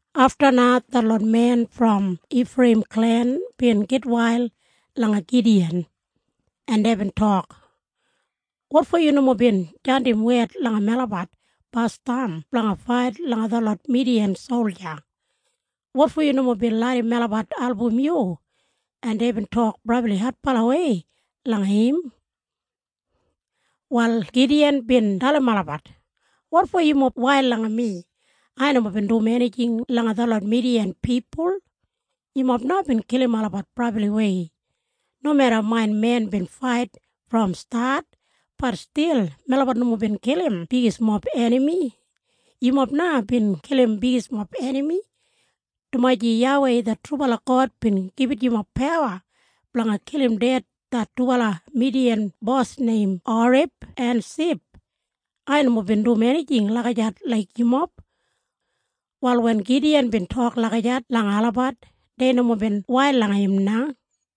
Afta na detlot men brom Ifreiyim klen bin gitwail langa Gidiyan, en deibin tok, “Wotfo yu nomo bin jandim wed langa melabat basdam blanga fait langa detlot Midiyan solja? Wotfo yu nomo bin larram melabat album yu?” En deibin tok brabli adbalawei langa im. Wal Gidiyan bin dalim olabat, “Wotfo yumob wail langa mi? Ai nomo bin dum enijing langa detlot Midiyan pipul. Yumob na bin kilim olabat brabliwei. Nomeda main men bin fait brom stat, bat stil melabat nomo bin kilim bigismob enami. Yumob na bin kilim bigismob enami, dumaji YAWEI det trubala God bin gibit yumob pawa blanga kilim ded det dubala Midiyan bos neim Oreb en Sib. Ai nomo bin dum enijing lagijat laik yumob.” Wal wen Gidiyan bin tok lagijat langa olabat, dei nomo bin wail langa im na.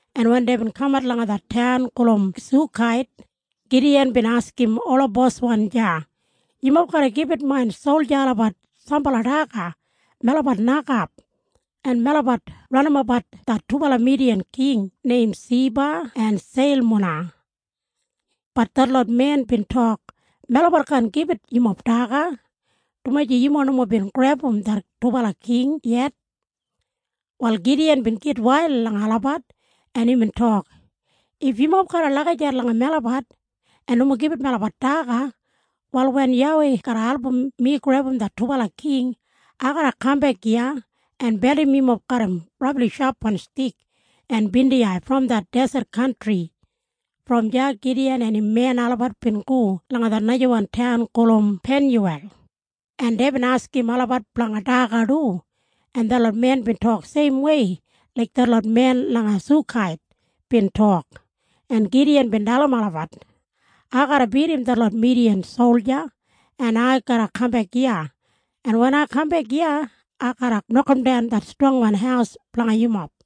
en wen deibin kamat langa det taun gulum Sukait, Gidiyan bin askim ola bosmen deya, “Yumob garra gibit main solja olabat sambala daga. Melabat nokap, en melabat ranimapbat det dubala Midiyan king neim Seba en Seilmuna.” Bat detlot men bin tok, “Melabat kaan gibit yumob daga, dumaji yumob nomo bin grebum det dubala king yet.” Wal Gidiyan bin gitwail langa olabat, en imbin tok, “If yumob garra lagijat langa melabat en nomo gibit melabat daga, wal wen YAWEI garra album mi grebum det dubala king, ai garra kambek iya en beldim yumob garram brabli shapwan stik en bindiyai brom det deset kantri.” Brom deya Gidiyan en im men olabat bin go langa det najawan taun gulum Penyuwel, en deibin askim olabat blanga daga du, en detlot men bin tok seimwei laik detlot men langa Sukait bin tok, en Gidiyan bin dalim olabat, “Ai garra bidim detlot Midiyan solja, en ai garra kambek iya, en wen ai kambek iya, ai garra nokamdan det strongwan haus blanga yumob.”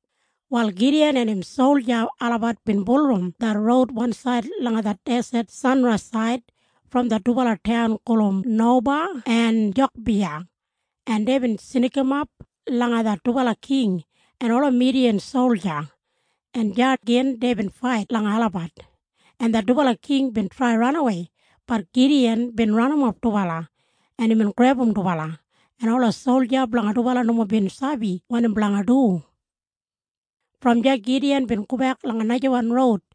Wal Gidiyan en im solja olabat bin bulurrum det roud wansaid langa det deset sanraisaid brom det dubala taun gulum Noba en Jogbeha, en deibin snikimap langa det dubala king en ola Midiyan solja, en deya gin deibin fait langa olabat, en det dubala king bin trai ranawei. Bat Gidiyan bin ranimap dubala, en imbin grebum dubala, en ola solja blanga dubala nomo bin sabi wanim blanga dum. Brom deya Gidiyan bin gobek langa najawan roud,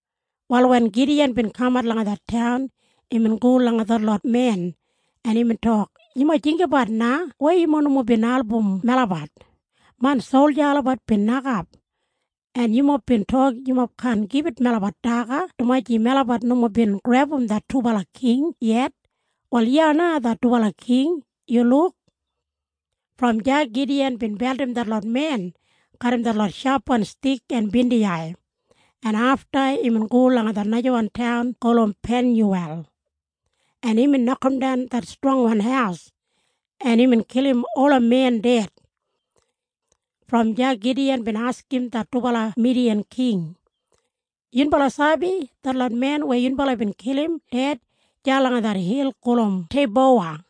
Wal wen Gidiyan bin kamat langa det taun, imbin go langa detlot men, en imbin tok, “Yumob jinggabat na weya yumob nomo bin album melabat. Main solja olabat bin nokap, en yumob bin tok yumob kaan gibit melabat daga dumaji melabat nomo bin grebum det dubala king yet. Wal iya na det dubala king, yu luk!” Brom deya Gidiyan bin beldim detlot men garram detlot shapwan stik en bindiyai, en afta imbin go langa det najawan taun gulum Penyuwel, en imbin nokamdan det strongwan haus, en imbin kilim ola men ded. Brom deya Gidiyan bin askim det dubala Midiyan king, “Yunbala sabi detlot men weya yunbala bin kilim ded deya langa det hil gulum Teibowa?”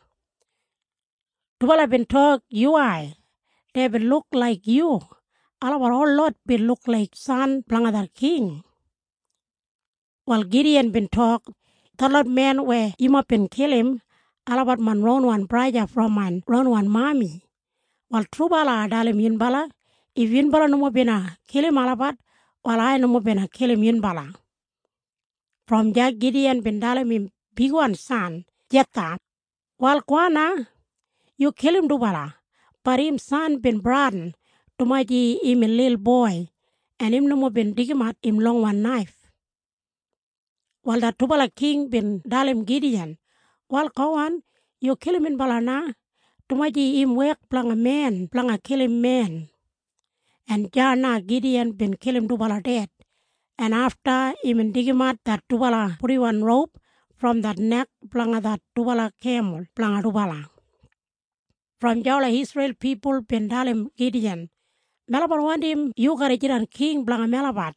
Dubala bin tok, “Yuwai. Deibin luk laik yu. Olabat holot bin luk laik san blanga det king.” Wal Gidiyan bin tok, “Detlot men weya yumob bin kilim, olabat main ronwan braja brom main ronwan mami. Wal trubala ai dalim yunbala. If yunbala nomo bina kilim olabat, wal ai nomo bina kilim yunbala.” Brom deya Gidiyan bin dalim im bigwan san Jetha, “Wal gowan na. Yu kilim dubala.” Bat im san bin bradin, dumaji imbin lilboi, en im nomo bin deigimat im longwan naif. Wal det dubala king bin dalim Gidiyan, “Wal gowan, yu kilim minbala na, dumaji im wek blanga men blanga kilim men.” En deya na Gidiyan bin kilim dubala ded, en afta imbin deigimat det dubala purdiwan roup brom det nek blanga det dubala kemul blanga dubala. Brom deya ola Isreil pipul bin dalim Gidiyan, “Melabat wandim yu garra jidan king blanga melabat,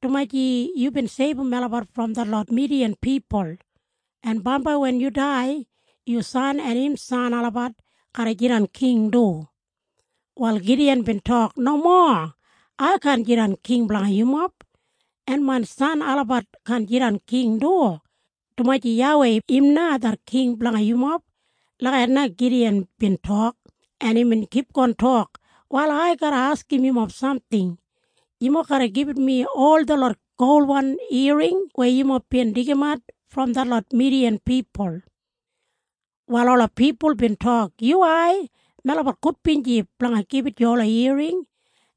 dumaji yubin seibum melabat brom detlot Midiyan pipul. En bambai wen yu dai, yu san en im san olabat garra jidan king du.” Wal Gidiyan bin tok, “Nomo. Ai kaan jidan king blanga yumob, en main san olabat kaan jidan king du, dumaji YAWEI im na det king blanga yumob.” Lagijat na Gidiyan bin tok, en imbin kipgon tok, “Wal ai garra askim yumob samting. Yumob garra gibit mi ol detlot golwan iyaring weya yumob bin deigimat brom detlot Midiyan pipul.” Wal ola pipul bin tok, “Yuwai. Melabat gudbinji blanga gibit yu ola iyaring.”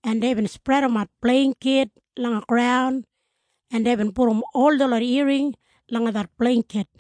En deibin spredimat bleingkit langa graun, en deibin pudum ol detlot iyaring langa det bleingkit,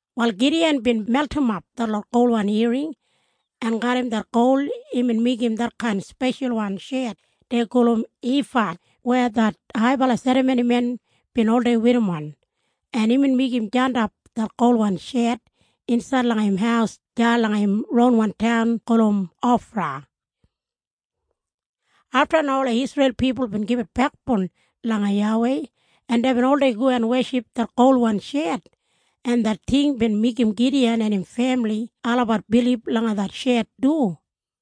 Wal Gidiyan bin meltimap detlot golwan iyaring, en garram det gol imbin meigim detkain speshalwan shet dei gulum ifad weya det haibala serramonimen bin oldei werrim, en imbin meigim jandap det golwan shet insaid langa im haus deya langa im ronwan taun gulum Ofra. Afta na ola Isreil pipul bin gibit bekboun langa YAWEI, en deibin oldei go en weship det golwan shet, en det ting bin meigim Gidiyan en im femili olabat bilib langa det shet du.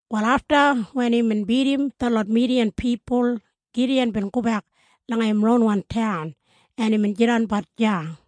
Wal afta wen imbin bidim detlot Midiyan pipul, Gidiyan bin gobek langa im ronwan taun, en imbin jidanbat deya.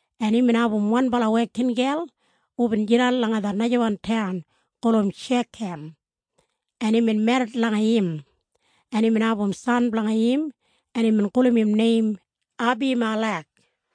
en imbin abum wanbala wekingel hubin jidan langa det najawan taun gulum Shekam, en imbin merrit langa im, en imbin abum san blanga im, en imbin gulum im neim Abimalek.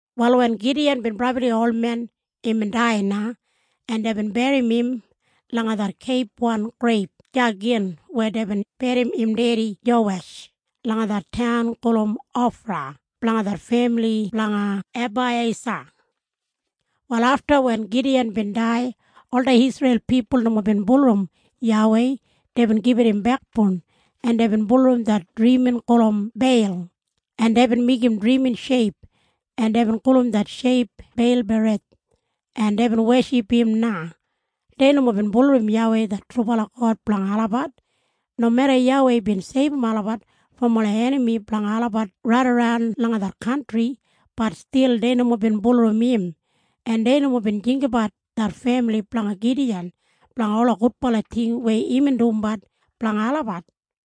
Wal wen Gidiyan bin brabli olmen, imbin dai na, en deibin berrim im langa det keibwan greib deya gin weya deibin berrim im dedi Jowesh, langa det taun gulum Ofra blanga det femili blanga Abaiyesa. Wal afta wen Gidiyan bin dai, ola Isreil pipul nomo bin bulurrum YAWEI. Deibin gibit im bekboun, en deibin bulurrum det drimin gulum Beil, en deibin meigim drimin sheip, en deibin gulum det sheip Beilberith, en deibin weship im na. Dei nomo bin bulurrum YAWEI det trubala God blanga olabat. Nomeda YAWEI bin seibum olabat brom ola enami blanga olabat raidaran langa det kantri, bat stil dei nomo bin bulurrum im, en dei nomo bin jinggabat det femili blanga Gidiyan blanga ola gudbala ting weya imbin dumbat blanga olabat.